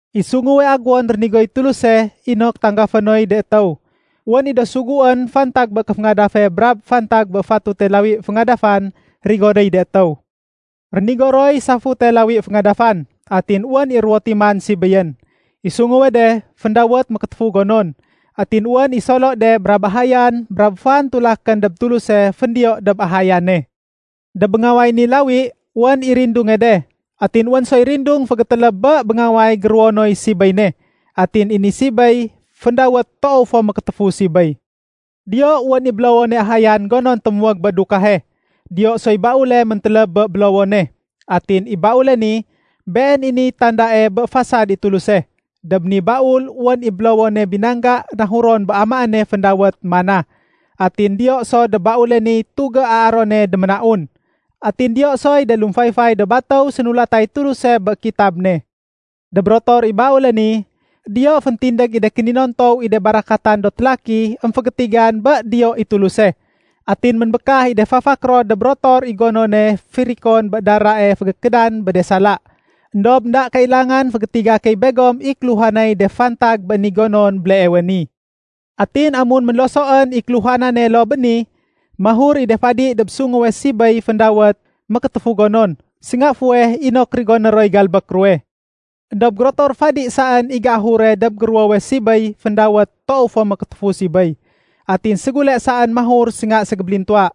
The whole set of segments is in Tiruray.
I sunguwe aguwon rénigoy Tuluse inok tanggafé noy de étéw, wén i do suguén fantag bé kéféngadafe brab fantag bé fatute lawi féngadafan rigonéy de étéw. Rénigo roy safute lawi féngadafan. Atin wén i ruwo timan sibéyén. I sunguwe de, féndawét “Mékétéfu gonon”, atin wén i solo de brab ahayan brab fan tulakén dob Tuluse féndiyo dob ahayane. Dob béngaway ni lawi wén i rindunge de. Atin wén soy rindung fégétéléb bé béngaway géruwonoy sibéy ne. Atin i ni sibéy féndawét “Toow fo Mékétéfu Sibéy”. Diyo wén i bélowone ahayan gonon témuwég bé dukahe. Diyo soy baule méntéléb bé bélowone. Atin i baule ni, been i niy tandae bé fasad i Tuluse. Dob ni baul wén i bélowone binangga nahuron bé amaéne féndawét “mana”. Atin diyo so dob baule niy tugé Aarone déménaun. Atin diyo soy de lumfayfay do batéw sénulatay Tuluse bé kitab ne. Dob rotor i baule ni, diyo féntindég i de kéninontow i de barakatan do télaki émfégétigan bé diyo i Tuluse. Atin ménbékah i de fafak ro dob rotor i gonone firikon bé darae fégékédan bé de sala. Endob énda kailangan fégétiga key begom i kéluhanay de fantag bé ni gonon béleewe ni. Atin amun ménlosoén i kéluhanane loo bé ni, mahur i de fadi dob sunguwe sibéy féndawét “Mékétéfu gonon” sénga fuweh inok rigoné roy galbék ruwe. Endob gérotor fadi saén i géahure dob géruwowe sibéy féndawét “Toow fo Mékétéfu Sibéy”. Atin ségule saén mahur sénga ségébélintuwa.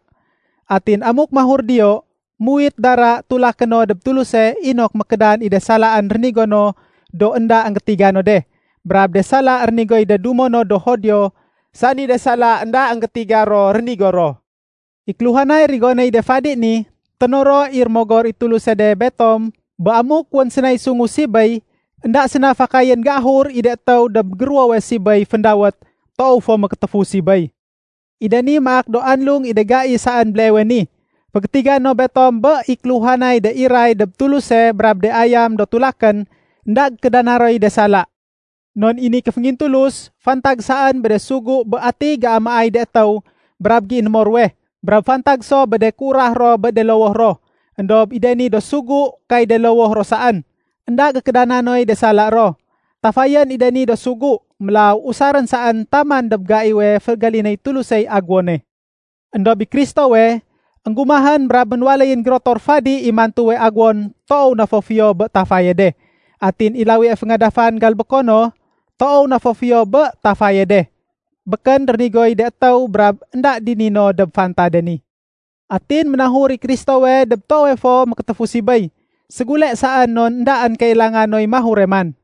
Atin amuk mahur diyo, muwit dara tulaké no dob Tuluse inok mékédan i de salaén rénigo no do énda énggétiga no de, brab de sala rénigoy de dumo no do Judio sani de sala énda énggétiga ro rénigo ro. I kéluhanay rigonéy de fadi ni, ténoro i Rémogor i Tuluse de betom bé amuk wén sénay sungu sibéy, énda séna fakayén géahur i de étéw dob géruwowe sibéy féndawét “Toow fo Mékétéfu Sibéy”. I de ni maak do anlung i de gai saén béleewe ni. Fégétiga no betom bé i kéluhanay de iray dob Tuluse brab de ayam do tulakén, énda gékédana roy de sala. Non i ni kéféngingtulus, fantag saén bé de sugu bé atiy géamaay de étéw brab géinémo ruwe, brab fantag so bé de kéurah ro bé de lowoh ro. Endob i de ni do sugu kay de lowoh ro saén, énda gékédana noy de sala ro. Tafayén i de ni do sugu, mélaw usarén saén taman dob gaiwe fégalinéy Tulusey aguwone. Endob i Kristowe, énggumahén brab ménwaléyén gérotor fadi i mantuwe aguwon toow na fo fiyo bé tafaye de. Atin i lawie féngadafan galbéko no, toow na fo fiyo bé tafaye de. Békén rénigoy de étéw brab énda dini no dob fantade ni. Atin ménahur i Kristowe dob Toowe fo Mékétéfu Sibéy ségule saén non éndaén kailanga noy mahure man.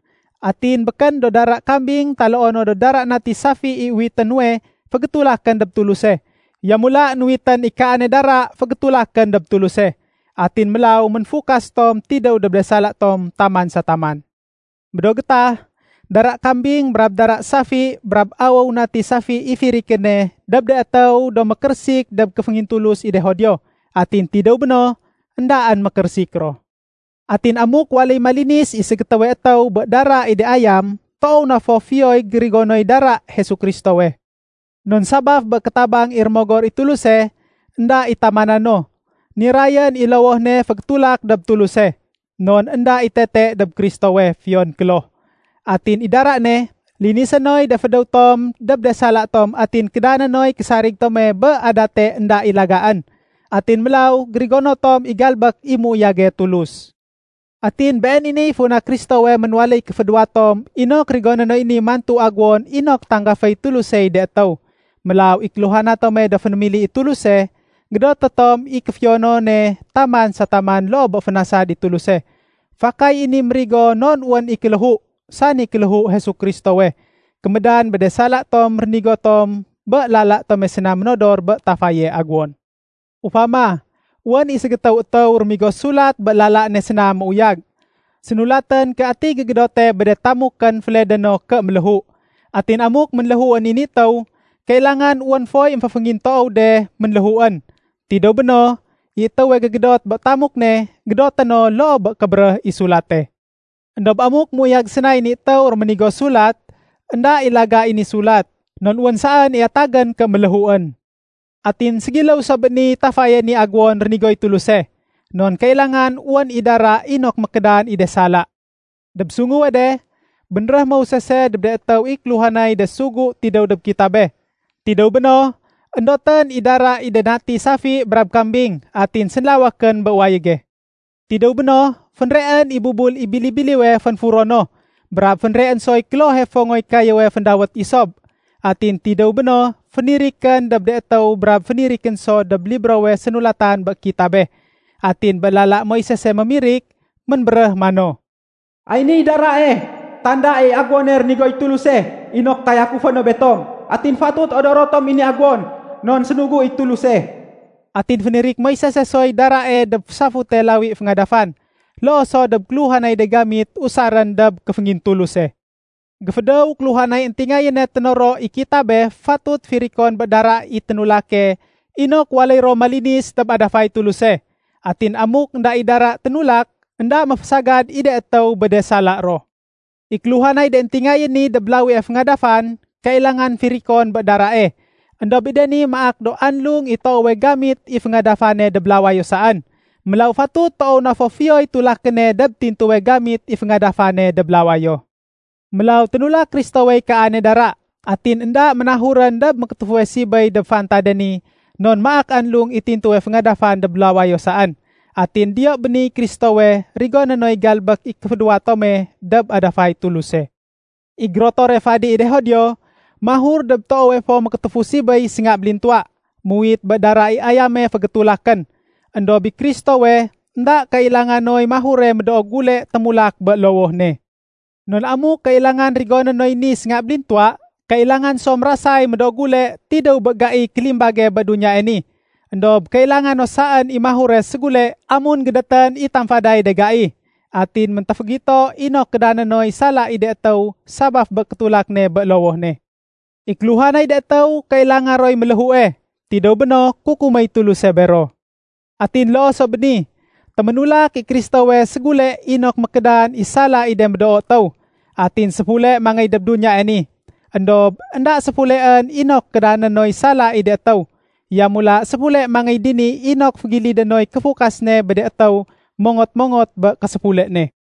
Atin békén do dara kambing taloo no do dara nati safi i uwité nuwe fégétulakén dob Tuluse. Yamula nuwitén i kaane dara fégétulakén dob Tuluse. Atin mélaw ménfukas tom tidéw dob de sala tom taman sa taman. Bé do gétah, dara kambing brab dara safi brab awéw i natiwe safi i firikéne dob de étéw do mékérésik dob kéféngintulus i de Judio. Atin tidéw béno, éndaén mékérésik ro. Atin amuk waléy malinis i ségétéwe étéw bé dara i de ayam, toow na fo fiyoy gérigonoy dara Jesu Kristowe. Non sabaf bé kétabang i Rémogor i Tuluse énda i tamana no, nirayén i lowoh ne fégétulak dob Tuluse. Non énda i tete dob Kristowe, fiyon kloh. Atin i dara ne, linisé noy de fédéw tom dob de sala tom atin kédané noy késarig tome bé adate énda i lagaén. Atin mélaw gérigono tom i galbék i méuyage Tuluse. Atin been i niy funa Kristowe ménwaléy kéféduwa tom inok rigoné noy ni mantu agéwon inok tanggaféy Tulusey de étéw. Mélaw i kéluhana tome do fénémili i Tuluse, gédoté tom i kéfiyonone taman sa taman loo bé fénasad i Tuluse. Fakay i ni mérigo non wén i kéléhu, sani kéléhu Jesu Kristowe, kémédan bé de sala tom rénigo tom bé lala tome séna ménodor bé tafaye agéwon. Ufama, wén i ségétéw étéw rémigo sulat bé lala ne séna méuyag. Sénulatén ké ati gégédote bé de tamukén féledé no ké méléhu. Atin amuk ménléhuén i ni étéw, kailangan wén foy émféféngintoow de ménléhuén. Tidéw béno, i étéwe gégédot bé tamuk ne, gédoté no loo bé kébéréh i sulate. Endob amuk méuyag sénay ni étéw réménigo sulat, énda i laga i ni sulat. Non wén saén i atagén ké méléhuén. Atin ségiléw so bé niy tafaye ni aguwon rénigoy Tuluse. Non kailangan wén i dara inok mékédan i de sala. Dob sunguwe de, bénréh Moisese dob de étéw i kéluhanay de sugu tidéw dob kitabe. Tidéw béno, éndotén i dara i de nati safi brab kambing atin sénlawékén bé wayége. Tidéw béno, fénreén i bubul i bili-biliwe fénfuro no, brab fénreén soy klohe fongoy kayéwe féndawét isob. Atin tidéw béno, fénirikén dob de étéw brab fénirikén so dob librowe sénulatan bé kitabe. Atin bé lala Moisese mémirik, ménbéréh mano, “Ay niy darae tanda i aguwone rénigoy Tuluse inok tayakufé no betom. Atin fatut odoro tom i ni agéwon non sénugu i Tuluse.” Atin fénirik Moisese soy darae dob safute lawi féngadafan, loo so dob kéluhanay de gamit usarén bé kéféngintuluse. Géfédéw kéluhanay éntingayéne ténoro i kitabe fatut firikon bé dara i ténulake inok waléy ro malinis dob adafay Tuluse. Atin amuk énda i dara ténulak, énda méfésagad i de étéw bé de sala ro. I kéluhanay de éntingayén ni dob lawie féngadafan kailangan firikon bé darae. Endob i de ni maak do anlung i toowe gamit i féngadafane dob lawayo saén. Mélaw fatut toow na fo fiyoy tulakéne dob tintuwe gamit i féngadafane dob lawayo. Mélaw ténulak Kristowey kaane dara. Atin énda ménahurén dob mékétéfuwe sibéy dob fantade ni non maak anlung i tintuwe féngadafan dob lawayo saén. Atin diyo béniy Kristowe rigoné noy galbék i kéféduwa tome dob adafay Tuluse. I gérotore fadi i de Judio mahur dob Toowe Fo Mékétéfu Sibéy sénga bélintuwa, muwit bé dara i ayame fégétulakén. Endob i Kristowe, énda kailanga noy mahure médoo gule témulak bé lowoh ne. Non amuk kailangan rigoné noy ni sénga bélintuwa, kailangan so mérasay médoo gule tidéw bé gaiy kélimbage bé duniyae ni. Endob kailanga no saén i mahure ségule amun gédétén i tamfaday de gai. Atin méntéfégito inok kédané noy sala i de étéw sabaf bé kétulak ne bé lowoh ne. I kéluhanay de étéw kailanga roy méléhue, tidéw béno kukuméy Tuluse bero. Atin loo so bé ni, téménulak i Kristowe ségule inok mékédan i sala i de medoo étéw. Atin séfule mangéy dob duniyae ni. Endob énda séfuleén inok kédané noy sala i de étéw. Yamula séfule mangéy dini inok fégilidé noy kéfukas ne bé de étéw mongot-mongot bé késéfule ne.